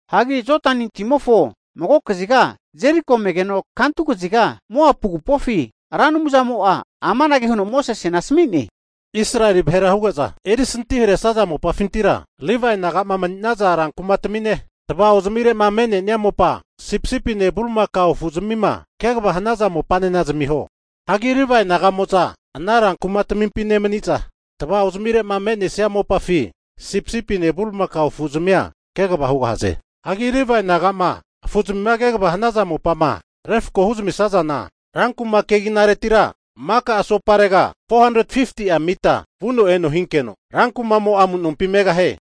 Hagi Jodani timofo mago kaziga Jeriko megeno kantu kaziga Moapu agupofi Ra Anumzamo'a amanage huno Mosesena asami'ne, Israeli vahera huge'za erisanti haresaza mopafintira, Livae nagama mani'naza rankumatami'ne, tava'ozamire'ma me'nenia mopa sipisipine bulimakao afu'zamima kegava hanaza mopanena zamiho. Hagi Livae naga'mo'za ana ran kumatamimpi nemani'za, tava'ozamire'ma me'nesia mopafi sipisipine bulimakao afu'zamia kegava hugahaze. Hagi Livae nagama afu'zamima kegava hanaza mopama refko huzamisazana, rankuma keginaretira maka asoparega 450'a mita vuno eno hinkeno, ran kumamo'a amu'nompi megahie.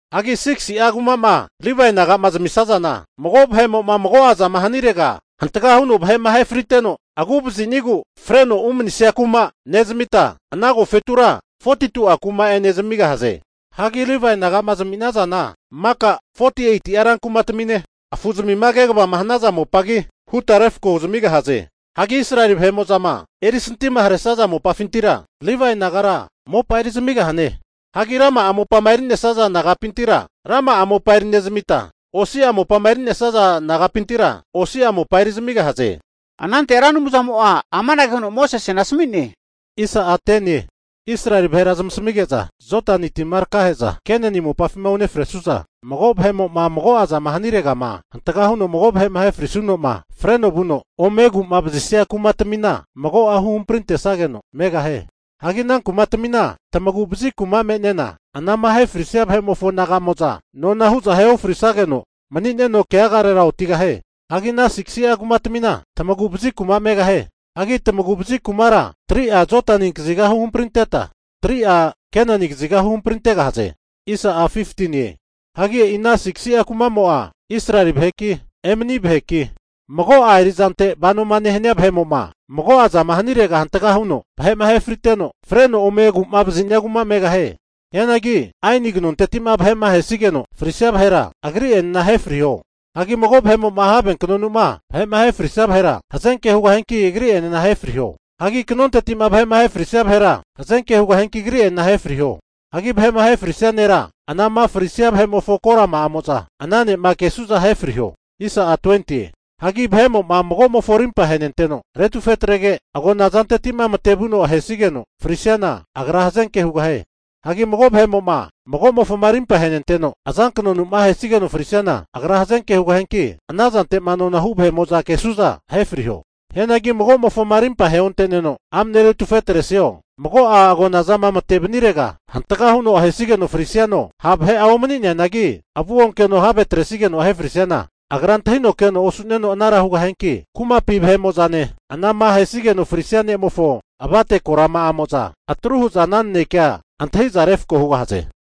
Hagi 6si'a kuma'ma Livae naga'ma zamisazana, mago vahe'mo'ma mago'azama hanirega hantagama huno vahe'ma ahefriteno, agu'vazinigu freno umanisia kuma nezamita, ana agofetura 42'a kuma'ene zamigahaze. Hagi Livae nagama zami'nazana maka 48'a rankumatamine, afu'zamima kegavama hanaza mopagi huta refko huzamigahaze. Hagi Israeli vahe'mo'zama erisantima haresaza mopafintira Livae nagara mopa eri zamigahane. Hagi rama'a mopama eri'nesaza nagapintira, rama'a mopa eri'nezamita, osi'a mopama eri'nesaza nagapintira osi'a mopa eri zamigahaze. Anante Ra Anumzamo'a amanage huno Mosesena asami'ne, Israeli vahera zamasmige'za Jodani tima takahe'za Kenani mopafima unefresu'za, mago vahe'mo'ma mago'azama haniregama hantaga huno mago vahe'ma ahe frisuno'ma freno vuno ome agu'ma vazisia kumatamina mago'a huhamprintesageno megahie. Hagi ana kumatamina tamagu'vazi kuma me'nena anama ahe frisaza vahe'mofo naga'mo'za nona hu'za ahe ofrisageno mani'neno keagarera otigahie. Hagi ana 6si'a kumatamina tamagu'vazi kuma megahie. Hagi tamagu'vazi kumara 3'a Jodani kaziga huhamprinteta, 3'a Kenani kaziga huhamprintegahaze. Hagi e'i ana 6si'a kumamo'a Israeli vaheki, emani vaheki, mago'a erizante vanoma nehania vahe'mo'ma mago'azama hanirega hantga huno vahe'ma ahe friteno, freno ome agu'mavazi'nia kuma megahie. Hianagi aeni kanonteti'ma vahe'ma ahesigeno frisia vahera, agri'enena ahe friho. Hagi mago vahe'mo'ma have kanonuma vahe'ma ahefrisia vahera, hazenke hugahianki agri'enena ahefriho. Hagi kanonteti'ma vahe'ma ahefrisia vahera, hazanke hugahianki agri'enena ahe friho. Hagi vahe'ma ahefrisia nera anama frisia vahe'mofo korama'amo'za ana ne'ma kesu'za ahefriho. Hagi vahe'mo'ma magomofo arimpa ahenenteno retufetrege, agona zantetima matevuno ahesigeno frisiana, agra hazenke hugahie. Hagi mago vahe'mo'ma, mago'mofoma rimpa ahenenteno azankanonu'ma ahesigeno frisiana, agra hazenke hugahianki, ana zante'ma nona hu vahe'mo'za kesu'za ahe friho. Hianagi mago'mofoma arimpa aheonte'neno amne retufetresio, mago'a agonazama mate vanirega hantaga huno ahenigeno frisiano, ha' vahe'a omani'neanagi avu onkeno have atresigeno ahefrisiana, agra antahino keno osu'neno anara hugahianki, kumapi vahe'mo'zane anama ahenageno frisia ne'mofo avate korama'amo'za atruhu'za ana nanekea antahiza refko hugahaze.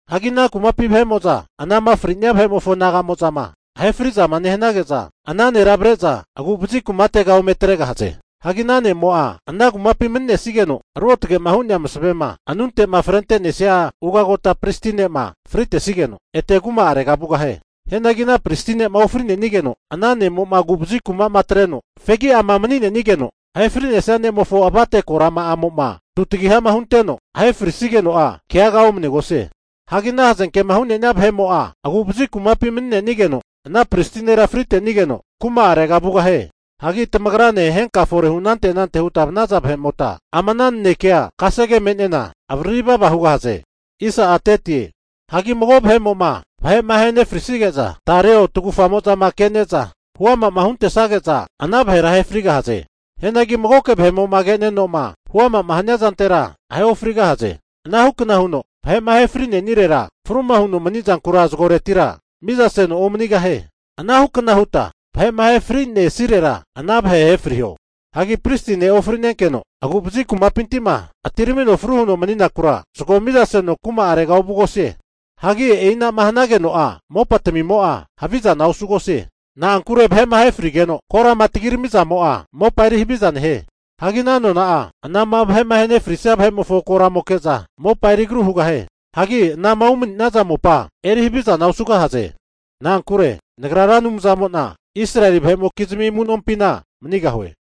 Hagi ana kumapi vahe'mo'za, anama fri'nea vahe'mofo naga'mo'zama ahefrizama nehanage'za, ana nera avre'za agu'vazi kumatega ome atregahaze. Hagi ana ne'mo'a ana kumapi mani'nesigeno, ruotage'ma hu'nea masavema anunte'ma frente'nesia ugota pristi ne'ma fritesigeno, ete kuma'arega vugahie Hianagi ana pristi ne'ma ofri'nenigeno, ana ne'mo'ma agu'vazi kumama atreno fegi'ama mani'nenigeno, ahe fri'nesia ne'mofo avate korama'amo'ma tutagiha'ma hunteno ahefrisigeno'a keaga omanegosie. Hagi ana hazenke'ma hu'nenia vahe'mo'a agu'vazi kumapi mani'nenigeno ana pristi nera fritenigeno kuma'arega vugahie. Hagi tamagrane henkama fore hu anante anante'ma huta vanaza vahe'mota, ama ana nanekea kasege me'nena avariri vava hugahaze. Hagi mago vahe'mo'ma vahe'ma ahe nefrisige'za tareo tagufamo'zama kene'za huama'ma huntesage'za ana vahera ahe frigahaze. Hianagi magoke vahe'mo'ma ke'neno'ma huamama hania zantera, ahe ofrigahaze. Ana hukna huno vahe'ma ahe fri'nenirera, fruma huno manizankura zagoretira mizaseno omanigahie. Anahukna huta vahe'ma ahe fri'nesirera, ana vahe ahefriho. Hagi pristi ne'ma ofri'nenkeno agu'vazi kumapintima atiramino fru huno mani'nakura, zago mizaseno kuma'arega ovugosie. Hagi e'inama hanageno'a mopatamimo'a havizana osugosie. Na'ankure vahe'ma ahefrigeno korama tagirami zamo'a, mopa eri haviza nehie. Hagi ana nona'a, anama vahe'ma ahe fri'nesia vahe'mofo koramoke'za mopa eri agru hugahie. Hagi ana'ma umani'naza mopa eri havizana osugahaze. Na'ankure Nagra Ra Anumzamo'na Israeli vahe'mokizmi amu'nompina manigahue.